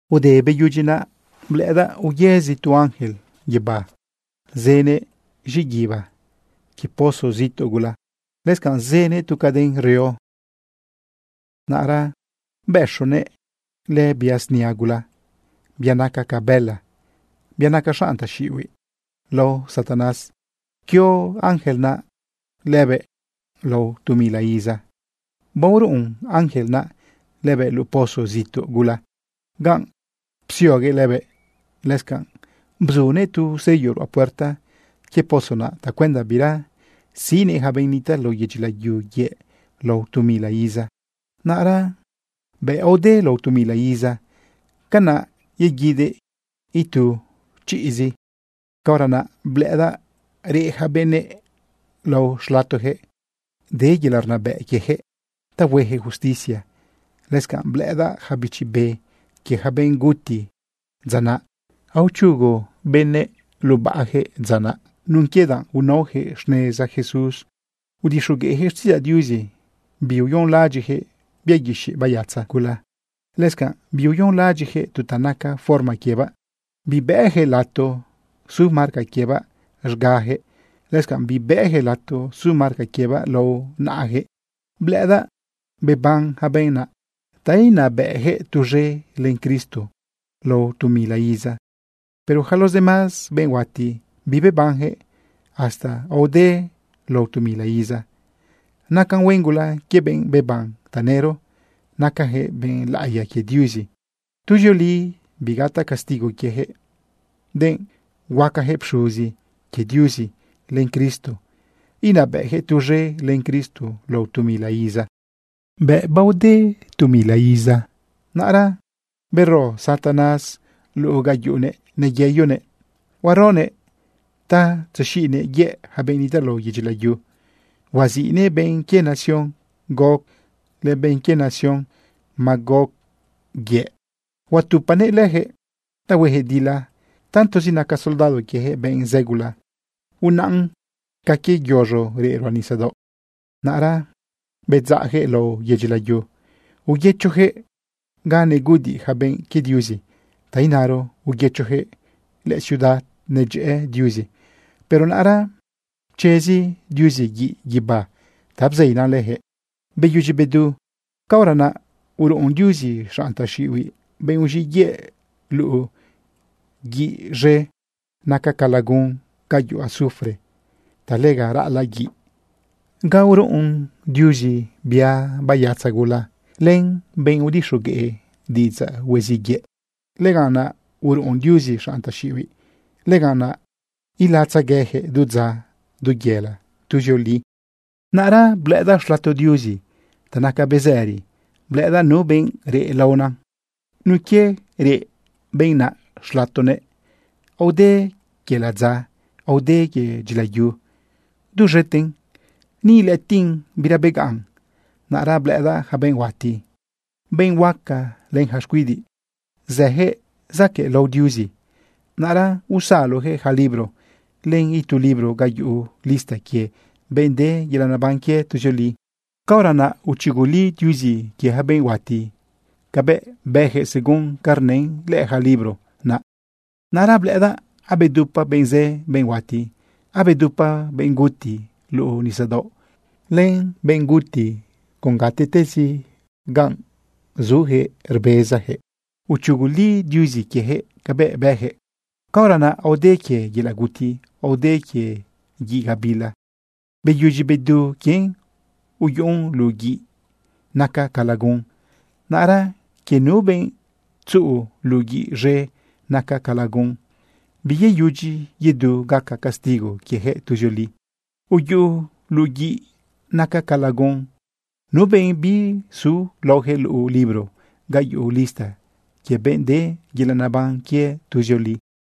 Ude beyudyi naꞌ blëꞌëdaꞌ uyëzi tu ángel guibá zënëꞌ z̃iꞌguiba quie pozo zituꞌ gula, lëscanꞌ zënëꞌ tu caden reo. Naꞌra bëxonëꞌ lëbia snia gula, bia naca ca bëla, bia naca xanꞌ taxiꞌihuiꞌ lao Satanás. Pquio ángel naꞌ lëbëꞌ lao tu mila iza. Baoruꞌun ángel naꞌ lëbëꞌ luꞌu pozo zituꞌ gula ganꞌ psioguëꞌ lëbëꞌ, lëscanꞌ bzunëꞌ tu sello ruꞌa puerta quie pozo naꞌ tacuenda bira siꞌnëꞌ ja benꞌ nitaꞌ lao yedyi layu yëꞌ lao tu mila iza. Naꞌra bëꞌ aode lao tu mila iza, canaꞌ yeguidëꞌ itu chiꞌzi. Caora naꞌ blëꞌëdaꞌ reꞌ yaca benëꞌ lao xlatojëꞌ. De yelaꞌ rnabëꞌ quiejëꞌ ta huejëꞌ justicia. Lëscanꞌ blëꞌëdaꞌ ja bichi be quie ja benꞌ guti dza naꞌ. Aochugu benëꞌ lubaꞌjëꞌ dza naꞌ nun quie danꞌ unaojëꞌ xneza Jesús udixogueꞌjëꞌ xtiꞌidzaꞌ Diuzi. Biuyonlaꞌadyiꞌjëꞌ bia guixiꞌ bayatza gula. Lëscanꞌ biuyonlaꞌadyiꞌjëꞌ tu ta naca forma quiebaꞌ. Bibëjëꞌ lato su marca quiebaꞌ z̃gajëꞌ. Lëscanꞌ bibëjëꞌ lato su marca quiebaꞌ lao naꞌajëꞌ. Blëꞌëdaꞌ beban ja benꞌ naꞌ ta inabëꞌjëꞌ tuz̃e len Cristo lao tu mila iza. Pero ja los demás benꞌ huati, bibebanjëꞌ hasta aode lao tu mila iza. Naca huen gula quie benꞌ beban tanëro. Nacajëꞌ benꞌ laꞌiya quie Diuzi. Tuzioli bigataꞌ castigo quiejëꞌ, denꞌ huacajëꞌ pxuzi quie Diuzi len Cristo. Inabëꞌjëꞌ tuz̃e len Cristo lao tu mila iza. Bëꞌ aode tu mila iza, naꞌra bero Satanás luꞌu ga yuꞌunëꞌ neyeyonëꞌ. Huaronëꞌ ta tzexiꞌnëꞌ yëꞌ ja benꞌ nitaꞌ lao yedyi layu. Huaziꞌnëꞌ benꞌ quie nación Gog len benꞌ quie nación Magog yëꞌ. Huatupanëꞌ lëjëꞌ ta huejëꞌ dila. Tantozi naca soldado quiejëꞌ benꞌ zë gula, unaꞌn ca quie yoz̃o reꞌ ruꞌa nisadaoꞌ. Naꞌra bedzaꞌjëꞌ lao yedyi layu, uyëchojëꞌ ga neguꞌudiꞌ ja benꞌ quie Diuzi, ta inaro uyëchojëꞌ lëciudad nedyëꞌë Diuzi. Pero naꞌra pchezi Diuzi guiꞌ guibá ta bzeinan lëjëꞌ beyudyi bedu. Caora naꞌ uruꞌun Diuzi xanꞌ taxiꞌihuiꞌ, benꞌ uz̃iꞌ yëꞌ, luꞌu guiꞌ z̃e naca ca lagun ga yuꞌu azufre ta lega raꞌalaꞌ guiꞌ. Ga uruꞌun Diuzi lëbia bayatza gula, len lëbenꞌ udixogueꞌ diꞌidzaꞌ huiziꞌ yëꞌ, lëganꞌ naꞌ uruꞌun Diuzi xanꞌ taxiꞌihuiꞌ. Lëganꞌ naꞌ ilatzeguejëꞌ du dza, du yela, tuzioli. Naꞌra blëꞌëdaꞌ xlato Diuzi ta naca bezëri. Blëꞌëdaꞌ nu benꞌ reꞌ laona. Nun quie reꞌ benꞌ naꞌ xlatoguëꞌ, aode quie ladza, aode quie dyilayu duz̃eten. Ni ilëꞌëtiꞌn bira begaꞌn. Naꞌra blëꞌëdaꞌ ja benꞌ huati, benꞌ huaca len ja xcuidiꞌ, zëjëꞌ zaquëꞌlao lao Diuzi. Naꞌra usalojëꞌ ja libro len itu libro ga yuꞌu lista quie benꞌ de yelaꞌ neban quie tuzioli. Caora naꞌ uchuguli Diuzi quie ja benꞌ huati cabëꞌ bëjëꞌ según ca rnën lëꞌë ja libro naꞌ. Naꞌra blëꞌëdaꞌ abedupa benꞌ zë, benꞌ huati. Abedupa benꞌ guti luꞌu nisadaoꞌ len benꞌ guti con gatiꞌtezi ganꞌ zujëꞌ rbezajëꞌ. Uchuguli Diuzi quiejëꞌ cabëꞌ bëjëꞌ. Caora naꞌ aode quie yelaꞌ guti, aode quie guiꞌ gabila. Beyudyi bedu quien uyuꞌun luꞌu guiꞌ naca ca lagun. Naꞌra quie nu benꞌ tzuꞌu luꞌu guiꞌ z̃e naca ca lagun, biyeyudyi yedu gaca castigo quiejëꞌ tuzioli. Uyuꞌu luꞌu guiꞌ naca ca lagun nu benꞌ bizu laoje luꞌu libro ga yuꞌu lista quie benꞌ de yelaꞌ neban quie tuzioli.